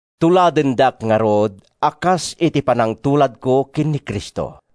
Tuladendak ngarud a kas iti panangtuladko ken ni Cristo.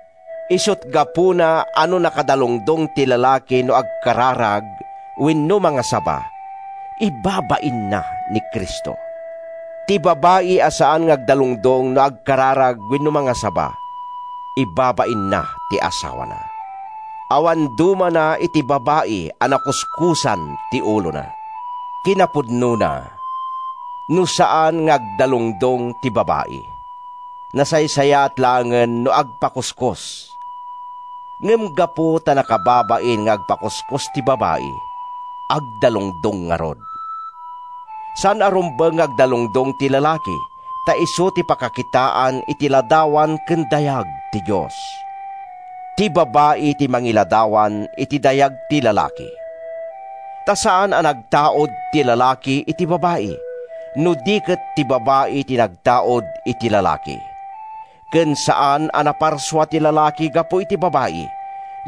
Isut’ gapuna a no nakadalungdong ti lalaki no agkararag wenno mangasaba, ibabainna ni Cristo. Ti babai a saan nga agdalungdong no agkararag wenno mangasaba, ibabainna ti asawana. Awan dumana iti babai a nakuskosan ti ulona. Kinapudnona, no saan nga agdalungdong ti babai, nasaysayaat laengen no agpakuskos. Ngem gapu ta nakababain nga agpakuskos ti babai, agdalungdong ngarud. Saan a rumbeng nga agdalungdong ti lalaki, ta isu ti pakakitaan iti ladawan ken dayag ti Dios. Ti babai ti mangiladawan iti dayag ti lalaki. Ta saan a nagtaud ti lalaki iti babai, no di ket ti babai ti nagtaud iti lalaki. Ken saan a naparsua ti lalaki gapu iti babai,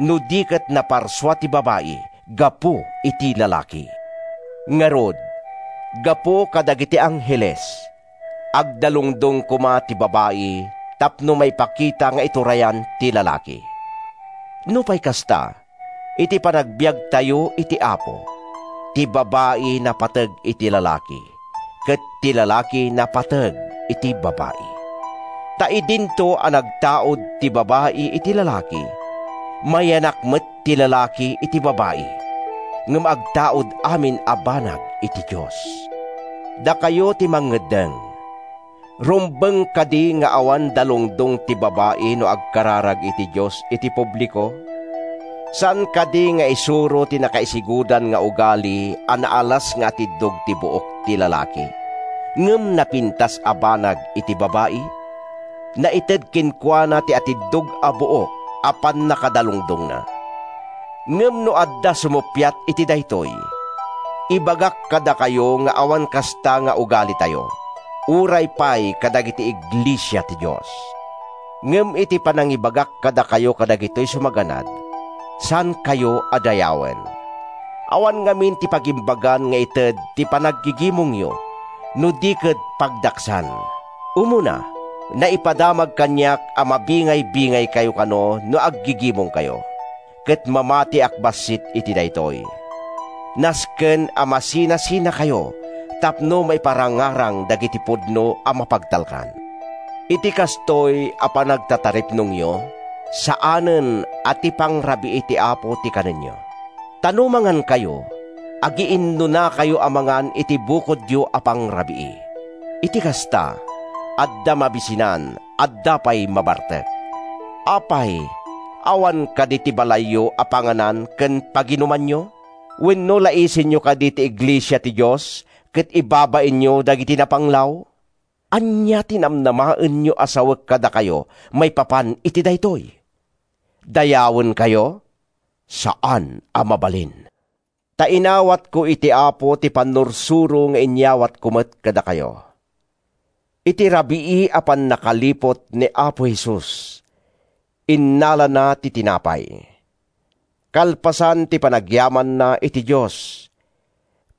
no di ket naparsua ti babai gapu iti lalaki. Ngarud, gapu kadagiti angheles, agdalungdong koma ti babai tapno maipakita nga iturayan ti lalaki. Nupay kasta, iti panagbiagtayo iti Apo, ti babai napateg iti lalaki ket ti lalaki napateg iti babai. Ta idinto a nagtaud ti babai iti lalaki, mayanak met ti lalaki iti babai; ngem agtaud amin a banag iti Dios. Dakayo ti mangeddeng: Rumbeng kadi nga awan dalungdong ti babai no agkararag iti Dios iti publiko? Saan kadi nga isuro ti nakaisigudan nga ugali a naalas nga atiddog ti buok ti lalaki ngem napintas a banag iti babai? Naited kenkuana ti atiddog a buok a pannakadalungdongna. Ngem no adda sumuppiat iti daytoy, ibagak kadakayo nga awan kasta nga ugalitayo, uray pay kadagiti iglesia ti Dios. Ngem iti panangibagak kadakayo kadagitoy sumaganad, saankayo a dayawen. Awan ngamin ti pagimbagan nga ited ti panaggigimongyo, no di ket pagdaksan. Umuna, naipadamag kaniak a mabingaybingaykayo kano no aggigimongkayo, ket mamatiak bassit iti daytoy. ( Nasken a masinasinakayo tapno maiparangarang dagiti pudno a mapagtalkan.) Iti kastoy a panagtataripnongyo, saanen a ti Pangrabii ti Apo ti kanenyo. Ta no mangankayo, agiinnunakayo a mangan iti bukodyo a pangrabii. Iti kasta, adda mabisinan, adda pay mabartek. Apay, awan kadi ti balayyo a panganan ken paginumanyo? Wenno laisenyo kadi ti iglesia ti Dios ket ibabainyo dagiti napanglaw? Ania ti namnamaenyo a sawek kadakayo maipapan iti daytoy? Dayawenkayo? Saan a mabalin! Ta inawatko iti Apo ti pannursuro nga inyawatko met kadakayo: Iti rabii a pannakaliput ni Apo Jesus, innalana ti tinapay. Kalpasan ti panagyamanna iti Dios,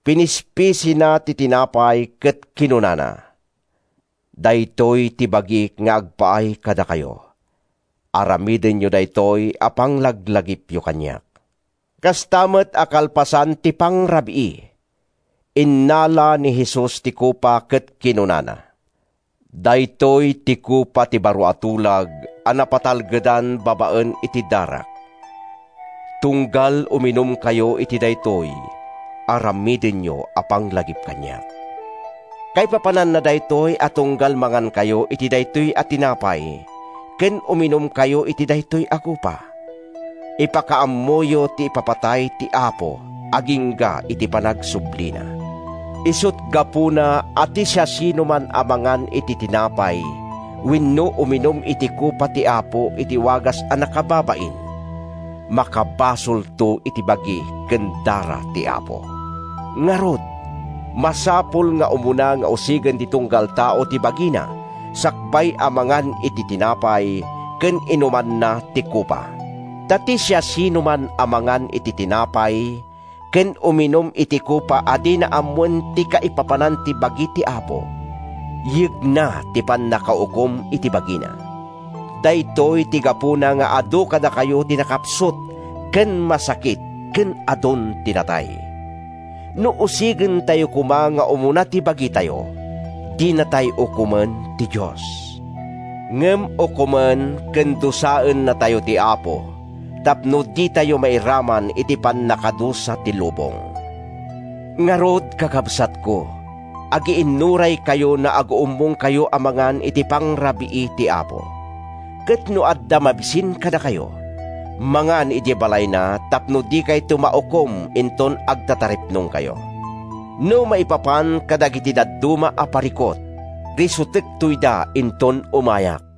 pinispisina ti tinapay ket kinunana, “Daytoy ti bagik nga agpaay kadakayo. Aramidenyo daytoy a panglaglagipyo kaniak.” Kasta met a kalpasan ti pangrabii, innala ni Jesus ti kopa ket kinunana, “Daytoy ti kopa ti baro a tulag a napatalgedan babaen iti darak. Tunggal uminumkayo iti daytoy, aramidenyo a panglagip kaniak.” Kaipapananna daytoy a tunggal mangankayo iti daytoy a tinapay ken uminumkayo iti daytoy a kopa, ipakaammoyo ti ipapatay ti Apo agingga iti panagsublina. Isut’ gapuna a ti siasinoman a mangan iti tinapay wenno uminum iti kopa ti Apo iti wagas a nakababain, makabasolto iti bagi ken dara ti Apo. Ngarud, masapul nga umuna nga usigen ti tunggal tao ti bagina sakbay a mangan iti tinapay ken inumanna ti kopa. Ta ti siasinoman a mangan iti tinapay ken uminum iti kopa a dina ammoen ti kaipapanan ti bagi ti Apo, yegna ti pannakaukom iti bagina. Daytoy ti gapuna nga adu kadakayo ti nakapsut ken masakit ket adun ti natay. No usigentayo koma nga umuna ti bagitayo, dinatay ukomen ti Dios. Ngem ukomen ken dusaennatayo ti Apo tapno ditayo mairaman iti pannakadusa ti lubong. Ngarud, kakabsatko, agiinnuraykayo no aguummongkayo a mangan iti Pangrabii ti Apo. Ket no adda mabisin kadakayo, mangan idiay balayna tapno dikayto maukom inton agtataripnongkayo. No maipapan kadagiti dadduma a parikut, risutekto ida inton umayak.